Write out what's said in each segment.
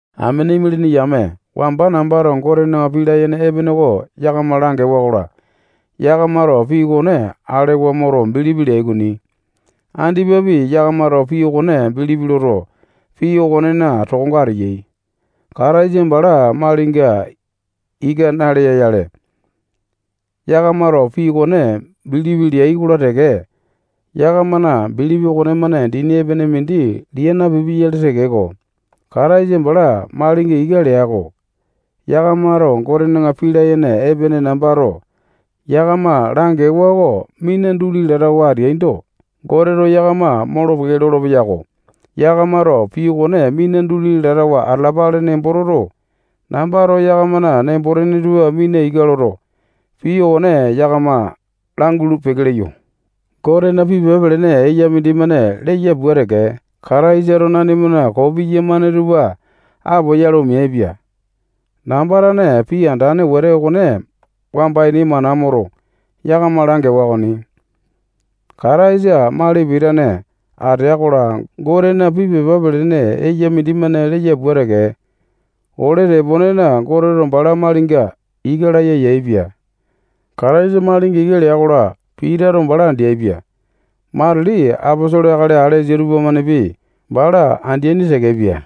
Amene imalini yame, wamba nambato Gotena pii layene epene oko yakama langewa-kola, yakamato pii okone alewa moto, bilipi leai okoni. Andipapi, yakamato pii okone bilipi loto, pii okonena tokonga ateyai. Kataisa bala malinga ika nalea-yale, yakamato pii okone bilipi leai-kola teke, yakamana bilipi okonemane dini epene mindi lia napipia-yale tekeko, Kataisa bala malinga ika lea-ko. Yakamato Gotena pii layene epene nambato yakama langewa oko mina duli latawa ateaindo, Goteto yakama molo-peke lolo-peyako. Yakamato pii okone mina duli latawa atalapale nembo toto, nambato yakamana nembo-tene tupa mina ika loto, pii okone yakama langulu-peke leyo. Gotena pii pepa pelene eya mindimane leya pua teke, Kataisato nanimana koo piyamane tupa apoyale omeaipia. Namba tane pii andane wete okone wamba ini mana moto, yakama langewa okoni. Kataisa mali pitane atea-kola, Gotena pii pepa pelene eya mindimane leya pua teke, ole teponena Goteto bala malinga ika laya yaepia. Kataisa malinga ika lea-kola, Pitato bala andeapia. Matili aposolo akali alesa tupamanepi bala andeaini tekepia.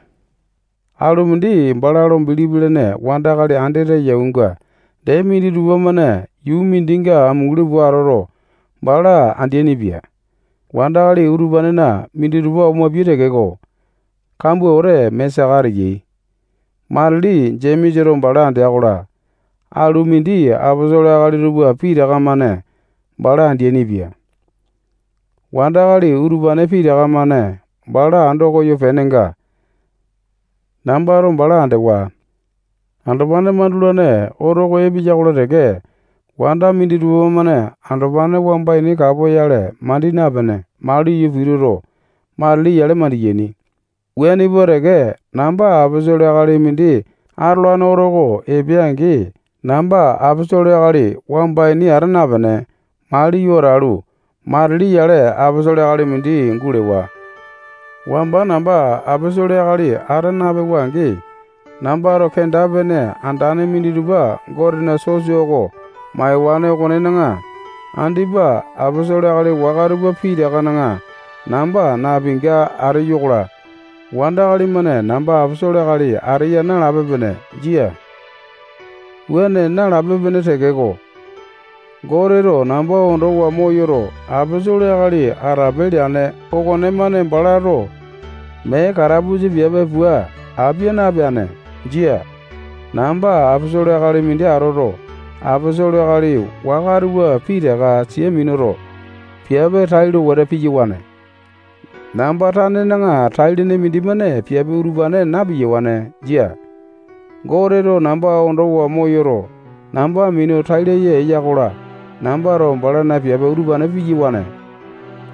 Alu mindi bala lo bilipi lene wandakali andete yaunga dee minditupa-mane yuu mindikinga amunguli pua atoto, bala andeaini-pia. Wandakali utupanena minditupa omapiai tekeko, kambua wete mee saka ateyai. Matili Jemesato bala andea-kola, alu mindi aposolo akali tupa pitaka-mane bala andeaini-pia. Wandakali utupane pitaka-mane bala ando koyo penenga, nambato bala andewa. Andopane mandulane oto oko epeya-kola teke, wanda minditupa-mane andopane wamba ini kapoyale mandi napene, maliyo pituto, matili yale mandiyaini. Wuane pua teke, namba aposolo akali mindi atolane oto oko epea-angi, namba aposolo akali wamba ini ata napene, maliyo atalu, matili yale aposolo akali mindi gulewa. Wamba namba aposolo akali ata napewa-angi, nambato kenda-pene andane minditupa Gotena sosa oko maiwane okonena, andipa aposolo akali waka tupa pitakana namba napinga ateyo-kola, wandakali-mane namba aposolo akali ateya nalape-pene. Jia. Wuane nalape-pene tekeko, Goteto namba ondowa moyoto, aposolo akali atape leane okonemane balato mee katapusa piape pua apia napeane. Jia. Namba aposolo akali mindi atoto, aposolo akali waka tupa pitaka sia minuto, piape tailo wete piyawane. Namba tanena tai-lene mindimane piape utupane na-piyawane. Jia. Goteto namba ondowa moyoto, namba minu tai laya eya-kola, nambato balana piape utupane piyawane.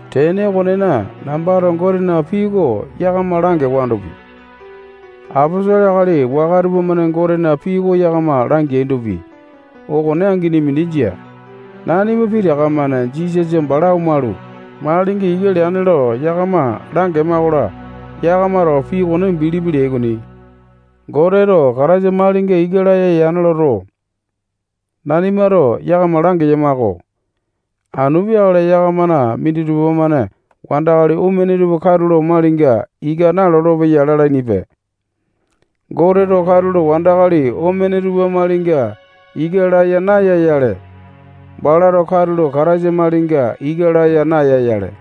Tene okonena, nambato Gotena pii oko yakama langewandopi, aposolo akali waka tupamane Gotena pii oko yakama langeaindopi, okone angini mindi jia. Nanima pitaka-mane Jisasa bala omalu, malinga ika leane lo yakama langema-kola, yakamato pii okone bilipi leai okoni. Goteto Kataisa malinga ika laya yane loto, nanimato yakama langeyama-ko. Anu peakale yakamana minditupa-mane wandakali omene tupa katulo malinga ika nalolo-peyai lalainipe. Goteto katulo wandakali omene tupa malinga ika laya naya-yale, balato katulo Kataisa malinga ika laya naya-yale.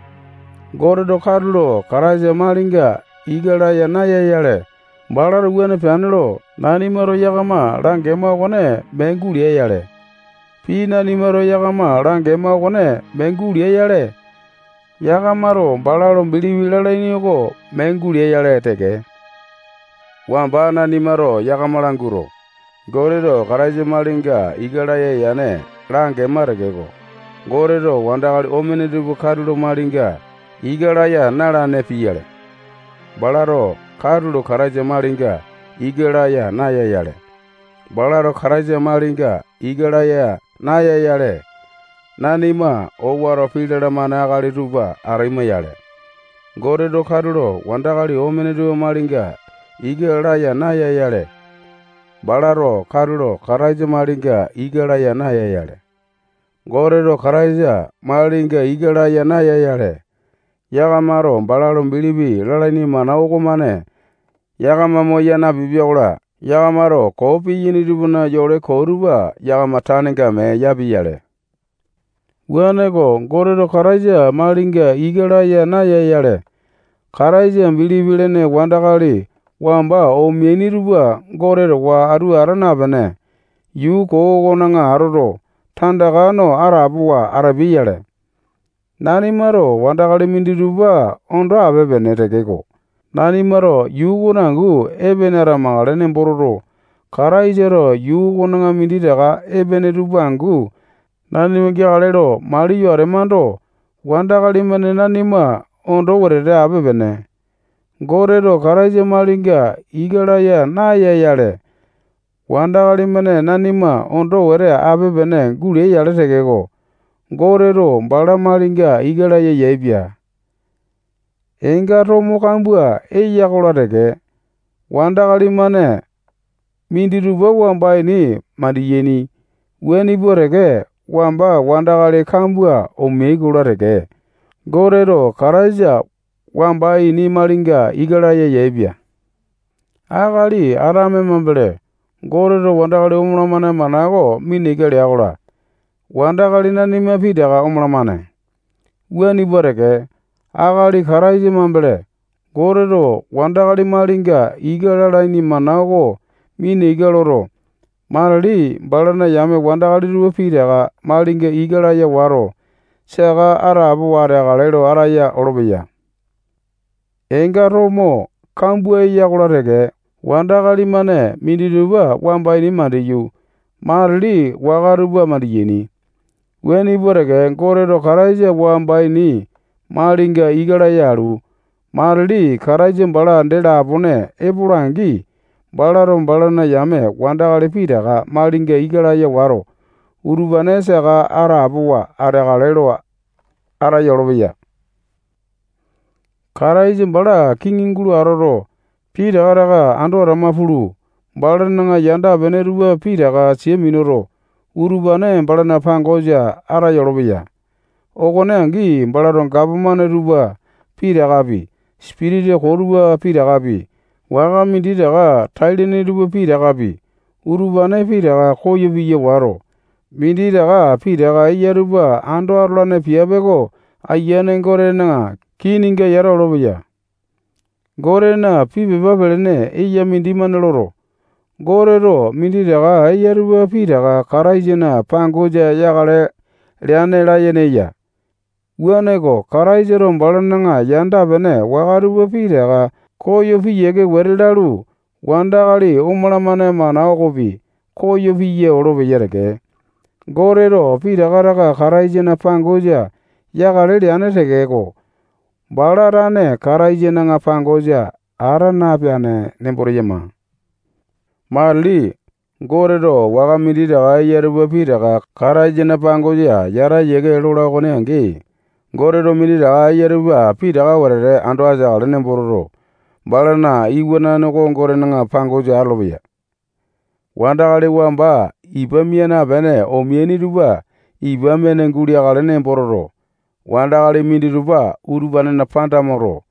Goteto katulo Kataisa malinga ika laya naya-yale, balato wuane peane lo nanimato yakama langema okone mee gulea-yale. Pii nanima yakama langema okone mee gulea-yale, yakamato bala lo bilipi lalaini oko mee gulea-yale teke. Wamba nanimato yakama languato, Goteto Kataisa malinga ika laya yane langema tekeko, Goteto wandakali omene tupa katulo malinga ika laya na-alane pia-yale, balato katulo Kataisa malinga ika laya naya-yale. Balato Kataisa malinga ika laya naya-yale, nanima owato pii lalamane akali tupa ataima-yale. Goteto katulo wandakali omene tupa malinga ika laya naya-yale, balato katulo Kataisa malinga ika laya naya-yale. Goteto Kataisa malinga ika laya naya-yale, yakamato bala lo bilipi lalaini mana okomane yakama moya napipia-kola, yakamato koo piyaini tupana yole koo tupa yakama tanenga mee yapia-yale. Wuaneko, Goteto Kataisa malinga ika laya naya-yale, Kataisa bilipi lene wandakali wamba omeaini tupa Gote towa atu ata napene, yuu koo okona atoto, tandaka no atapowa atapeai-yale. Nanimato wandakali minditupa ondo ape-pene tekeko, nanimato yuu okona angu epene atamakale nembo toto, Kataisato yuu okona minditaka epene tupa angu nanima geakale lo maliyo atemando, wandakali-mane nanima ondo wetete ape-pene. Goteto Kataisa malinga ika laya naya-yale, wandakali-mane nanima ondo wete ape-pene gulea-yale tekeko, Goteto bala malinga ika laya yaepia. Eenga tomo kambua eya-kola teke, wandakali-mane minditupa wamba ini mandiyaini. Wuane pua teke, wamba wandakali kambua omeai-kola teke, Goteto Kataisa wamba ini malinga ika laya yaepia. Akali Atame mambele, Goteto wandakali omalamane mana oko mina ika lea-kola, wandakali nanima pitaka omalamane. Wuane pua teke, Akali Kataisa mambele Goteto wandakali malinga ika lalaini mana oko mina ika loto, matili balana yame wandakali tupa pitaka malinga ika laya wato, saka atapowa ateakale lo ataya olopeya. Eenga tomo kambua eya-kola teke, wandakali-mane minditupa wamba ini mandiyu, matili waka tupa mandiyaini. Wuane pua teke, Goteto Kataisa wamba ini malinga ika laya alu, matili Kataisa bala dee lapone epola-angi, balato balana yame wandakali pitaka malinga ika laya wato, utupane saka atapowa ateakale lo ataya olopeya. Kataisa bala kiŋi gulo atoto, pitaka taka ando atama pulu, balana yanda-pene tupa pitaka sia minuto, utupane balana pangosa ataya olopeya. Okone angi, balato gapomane tupa pitakapi, sipitisa koo tupa pitakapi, waka minditaka tai-lene tupa pitakapi, utupane pitaka koyo piya wato, minditaka pitaka eya tupa ando atolane piape oko Ayiane Gotena kininga yata olopeya. Gotena pii pepa pelene eya mindimane loto, Goteto minditaka eya tupa pitaka Kataisana pangosa yakale leane layene eya. Wuaneko, Kataisato balana yanda-pene waka tupa pitaka koyo piyiake wete lalu, wandakali omalamane mana okopi koyo piya olopeya teke. Goteto pitaka taka Kataisana pangosa yakale leane tekeko, bala tane Kataisana pangosa ata napeane nembo teyama. Matili Goteto waka minditaka eya tupa pitaka Kataisana pangosa yata yiake lola okone angi, Goteto minditaka eya tupa pitaka wetete ando ateakale nembo toto, balana Iwanane oko Gotena pangosa atolopeya. Wandakali wamba ipa mia napene omeaini tupa ipa mene guleakale nembo toto, wandakali minditupa utupanena panda moto,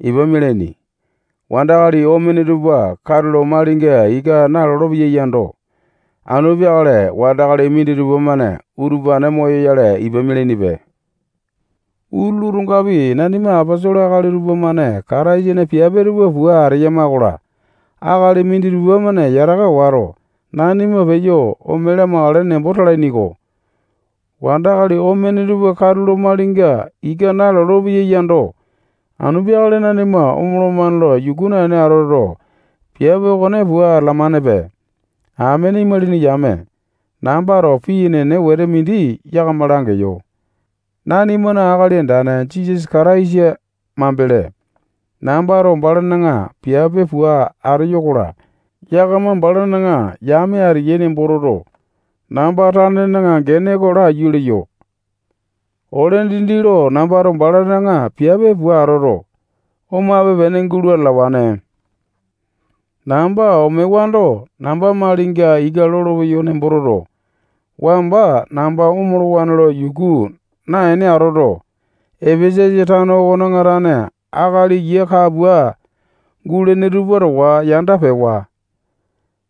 ipa mialaini. Wandakali omene tupa katulo malinga ika nalolo-peyai yando, anu peakale wandakali minditupa-mane utupane moyoyale, ipa mialainipe. Utulu, otongapi, nanima aposolo akali tupamane Kataisana piape tupa pua ateyama-kola, akali minditupa-mane yataka wato, nanima peyo ome lamakale nembo talaini-ko. Wandakali omene tupa katulo malinga ika nalolo-peyai yando, anu peakale nanima omolomane lo yuku naene atoto, piape okone pua atalamanepe. Amene imalini yame, nambato pii enene wete mindi yakama langeyo. Nanimana Akali Andane Jisasa Kataisa mambele, nambato balana piape pua ateyo-kola, yakama balana yame ateyai nembo toto, namba tanena gene oko laiyu leyo. Ole dindi lo nambato balana piape pua atoto, omape-pene gulo atalawane. Namba omewando, namba malinga ika lolo-peyawa nembo toto, wamba namba omolowane lo yuku naene atoto, Epesasa tano okona tane akali yia kapua gulene tupa towa yanda pewa.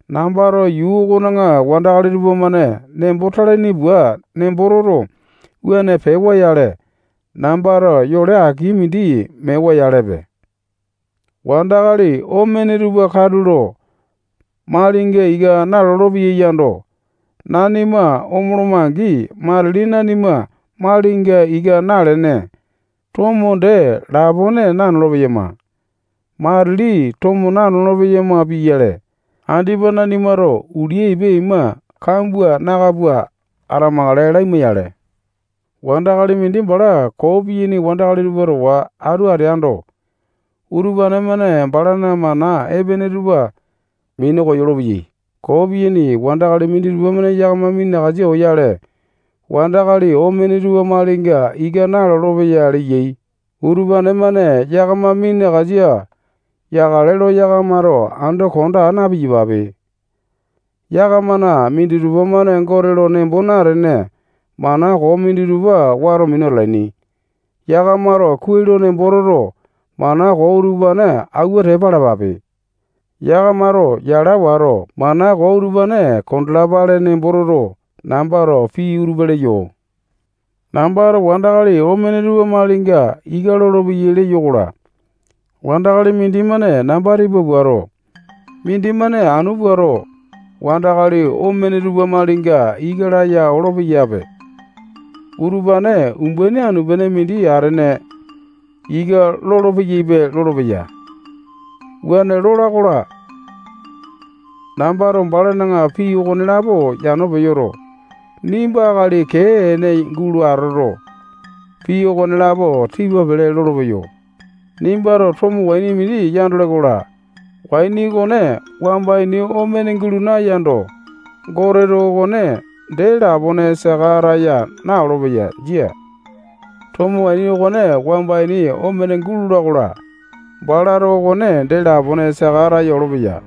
Nambato yuu okona wandakali tupamane nembo talaini pua nembo toto, wuane pewa-yale, nambato yole aki mindi mewa-yalepe. Wandakali omene tupa katulo malinga ika nalolo-peyai yando, nanima omoloma-angi, matili nanima malinga ika nalene, tomo dee lapone nanolo-peyama. Matili tomo nanolo-peyama pia-yale, andipa nanimato ulia ipa ima kambua naka pua atamakale laima-yale. Wandakali mindi bala koo piyaini wandakali tupa towa atu ateando, utupane-mane balana mana epene tupa minu koyolo-peyai. Koo piyaini wandakali minditupa-mane yakama minakasa oyale, wandakali omene tupa malinga ika nalolo-peyai leyai. Utupane-mane yakama minakasa yakale lo yakamato ando konda aa na-piyapape. Yakamana minditupa-mane Gote lo nembo natene, mana koo minditupa wato minu atalaini. Yakamato kuai lo nembo toto, mana koo utupane awua tepa alapape. Yakamato yala wato, mana koo utupane kondalapale nembo toto, nambato pii utupa leyo. Nambato wandakali omene tupa malinga ika lolopeyai leyo-kola, wandakali mindimane namba tipa puato, mindimane anu puato, wandakali omene tupa malinga ika laya olo-peyape. Utupane umbaini anu-pene mindi atene ika lolo-peyaipe lolopeya. Wuane lola-kola, nambato balana pii okonelapo yano peyoto, nimba akali kee ene gulo atoto, pii okonelapo tipa pele lolopeyo. Nimbato tomo waini mindi yandole-kola, waini okone wamba ini omene gulo nayando, Goteto okone dee lapone saka ataya na-olopeya. Jia. Tomo waini okone wamba ini omene gulola-kola, balato okone dee lapone saka ataya olopeya.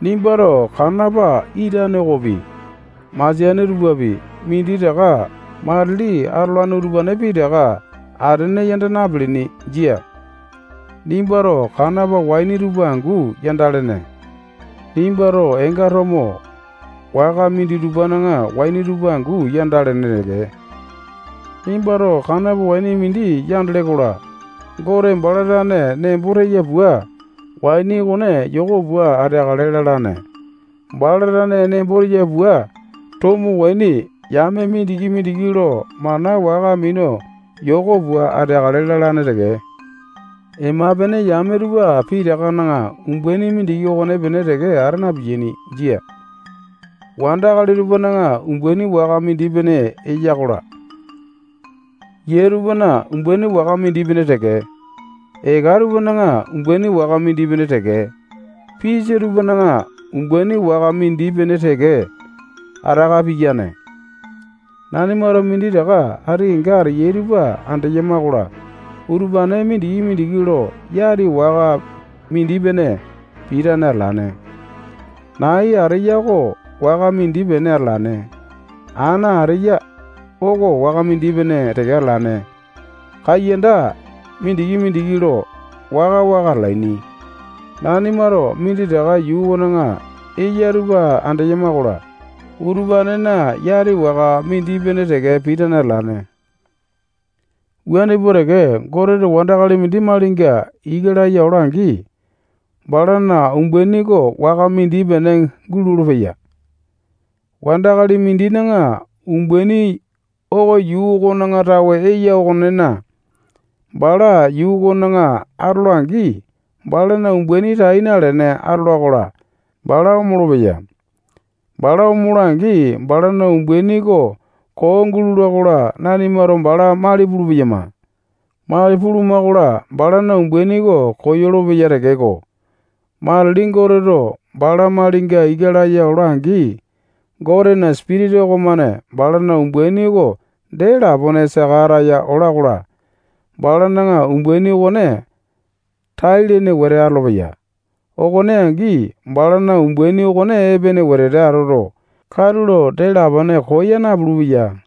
Nimbato kanapa itane okopi, masiane tupapi, minditaka matili atolane utupane pitaka atene yanda napilini. Jia. Nimbato kanapa waini tupa angu yandalene. Nimbato eenga tomo waka minditupana waini tupa angu yandalene teke. Nimbato kanopa waini mindi yandele-kola, Gote bala tane nembo teya pua, waini okone yoko pua ateakale lalane. Bala tane nembo teya pua, tomo waini yame mindiki-mindiki lo mana waka minu yoko pua ateakale lalane teke. Ema-pene yame tupa pitakana umbaini mindiki okonepene teke ata napiyane. Jia. Wandakali tupana umbaini waka mindi-pene eya-kola, yia tupana umbaini waka mindi-pene teke, eka tupana umbaini waka mindi-pene teke, pisa tupana umbaini waka mindi-pene teke ataka piyane. Nanimato minditaka ati kenga ateyai tupa andeyama-kola, utupane mindiki-mindiki lo yati waka mindi-pene pitane atalane. Nai ateya oko waka mindi-pene atalane. Ana ateya oko waka mindi-pene teke atalane. Kaiyanda mindiki-mindiki lo waka-waka atalaini. Nanimato minditaka yuu okona eyai tupa andeyama-kola, utupanena yati waka mindi-pene teke pitane atalane. Wuane pua teke, Goteto wandakali mindi malinga ika laya ola-angi, balana umbaini oko waka mindi-pene gulolo-peya. Wandakali mindina umbaini oko yuu okona tawe eya okonena, bala yuu okona atola-angi, balana umbaini tai nalene atola-kola, bala omolo-peya. Bala omola-angi, balana umbaini oko koo gulola-kola, nanimato bala mali pulu-peyama. Mali puluma-kola, balana umbaini oko koyolo-peya tekeko, matili Goteto bala malinga ika laya ola-angi, Gotena Sipitisa okomane balana umbaini oko dee lapone saka ataya ola-kola, balana umbaini okone tai-lene wete atolopeya. Okone angi, balana umbaini okone epene wete atoto, katulo dee lapone koya napulu-peya.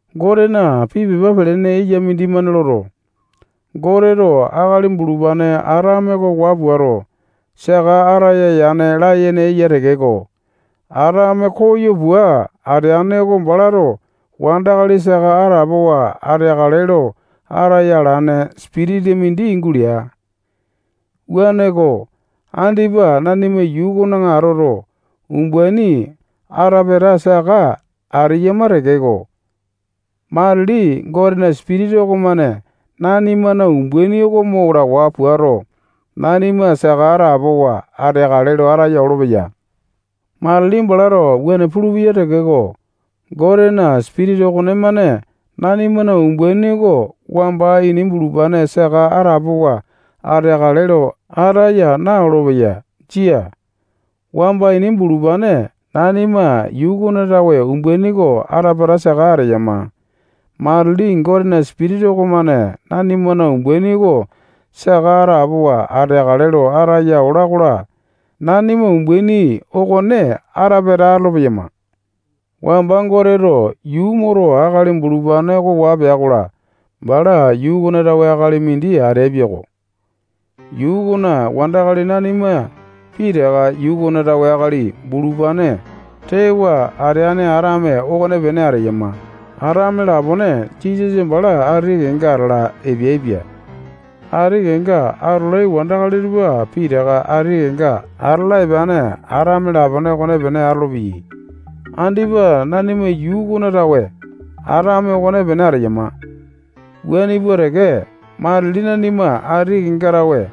Gotena pii pepa pelene eya mindimane loto, Goteto akali bulupane Atame oko waa puato, saka ataya yane layene eya tekeko, Atame koyo pua ateane oko balato wandakali saka atapowa ateakale lo ataya alane sipitisa mindi gulea. Wuaneko, andipa nanima yuu okona atoto, umbaini ata-pata saka ateyama tekeko, matili Gotena Sipitisa okomane nanimana umbaini oko mo lawa puato, nanima saka atapowa ateakale lo ataya olopeya. Matili balato wuane pulupeya tekeko, Gotena Sipitisa okonemane nanimana umbaini oko wamba ini bulupane saka atapowa ateakale lo ataya na-olopeya. Jia. Wamba ini bulupane nanima yuu okona tawe umbaini oko ata-pata saka ateyama. Matili Gotena Sipitisa okomane nanimana umbaini oko saka atapowa ateakale lo ataya ola-kola, nanima umbaini okone ata-pata atolo-peyama. Wamba Goteto yuu moto, akali bulupane oko waa pea-kola, bala yuu okona tawe akali mindi ateapia-ko. Yuu okona wandakali nanima pitaka yuu okona tawe akali bulupane tewa ateane Atame okonepene ateyama. Atame lapone Jisasa bala ati kenga atala epeaipia. Ati kenga atolai wandakali tupa pitaka ati kenga atala epeane Atame lapone okonepene atolopeyai. Andipa nanima yuu okona tawe Atame okonepene ateyama. Wuane pua teke, matili nanima ati kenga tawe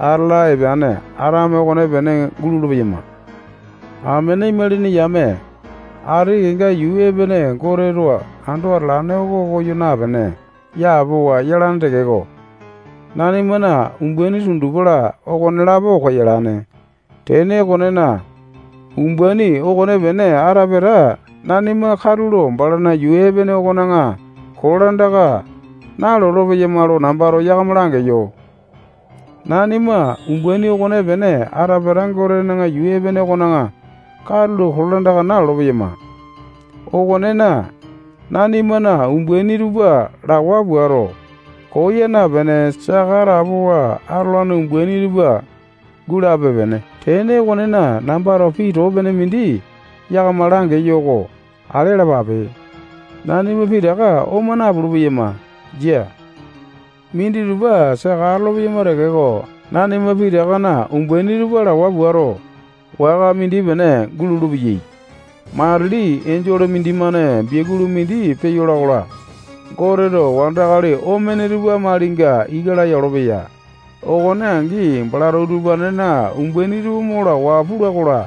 atala epeane Atame okonepene gulolo-peyama. Amene imalini yame, ati kenga yuu epene Goteto ando atalane oko koyo napene, yapowa yalane tekeko, nanimana umbaini tundupa-la, okonelapo koyalane. Tene okonena, umbaini okopene ata-pata nanima katulo balana yuu epene okone kolandaka nalolo-peyama lo nambato yakama langeyo. Nanima umbaini okonepene ata-pata Gotena yuu epene okona katulo kolandaka nalolo-peyama okonena, nanimana umbaini tupa lawa puato, koya napene, saka atapowa atolane umbaini tupa gulape-pene. Tene okonena, nambato pii too pene mindi yakama langeyo oko ale alapape. Nanima pitaka oma napulu-peyama jia. Minditupa saka atolo-peyama tekeko, nanima pitakana umbaini tupa lawa puato, waka mindi-pene gulolo-peyai. Matili enjole mindimane biakulu mindi peyola-kola, Goteto wandakali omene tupa malinga ika laya olopeya. Okone angi, balato utupanena umbaini tupa mo lawa pula-kola,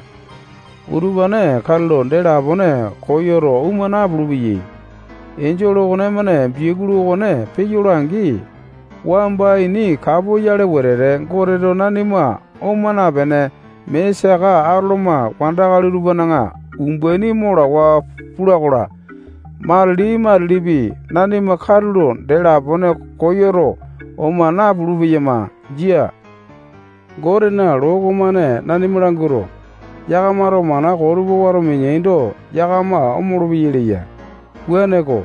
utupane katulo dee lapone koyoto oma napulu-peyai. Enjole okonemane biakulu okone peyola-angi, wamba ini kapoyale wetete Goteto nanima oma napene, mee saka atoloma wandakali tupana umbaini mo lawa pula-kola, matili-matilipi nanima katulo dee lapone koyoto, oma napulu-peyama. Jia. Gotena loo okomane nanima languato, yakamato mana koo tupa wato mineaindo, yakama omolo-peyai leya. Wuaneko,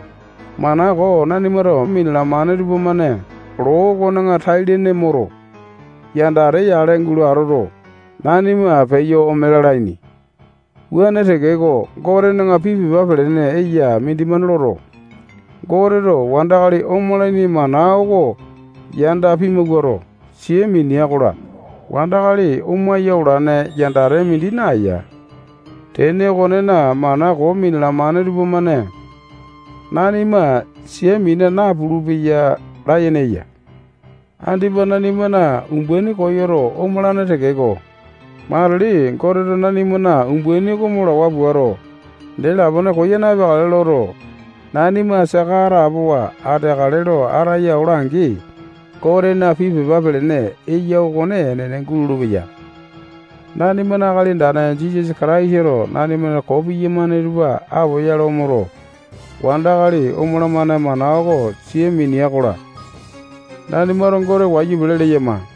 mana koo nanimato minalamane tupamane loo okona tai-lene moto, yandate yale gulo atoto, nanima peyo ome lalaini. Wuane tekeko, Gotena pii pepa pelene eya mindimane loto, Goteto wandakali omalaini mana oko yanda pimawuato, sia minea-kola, wandakali omaya olane yandate mindi naeya. Tene okonena, mana koo minalamane tupamane, nanima sia mina napulu-peyai layene eya. Andipa nanimana umbaini koyoto omolane tekeko, matili Goteto nanimana umbaini oko mo lawa puato, dee lapone koya napeakale loto, nanima saka atapowa ateakale lo ataya ola-angi, Gotena pii pepa pelene eya okone enene gulolo-peya. Nanimana Akali Andane Jisasa Kataisato nanimana koo piyamane tupa apoyale omoto, wandakali omolomane mana oko sia minea-kola, nanimato Gote wayu pele leyama.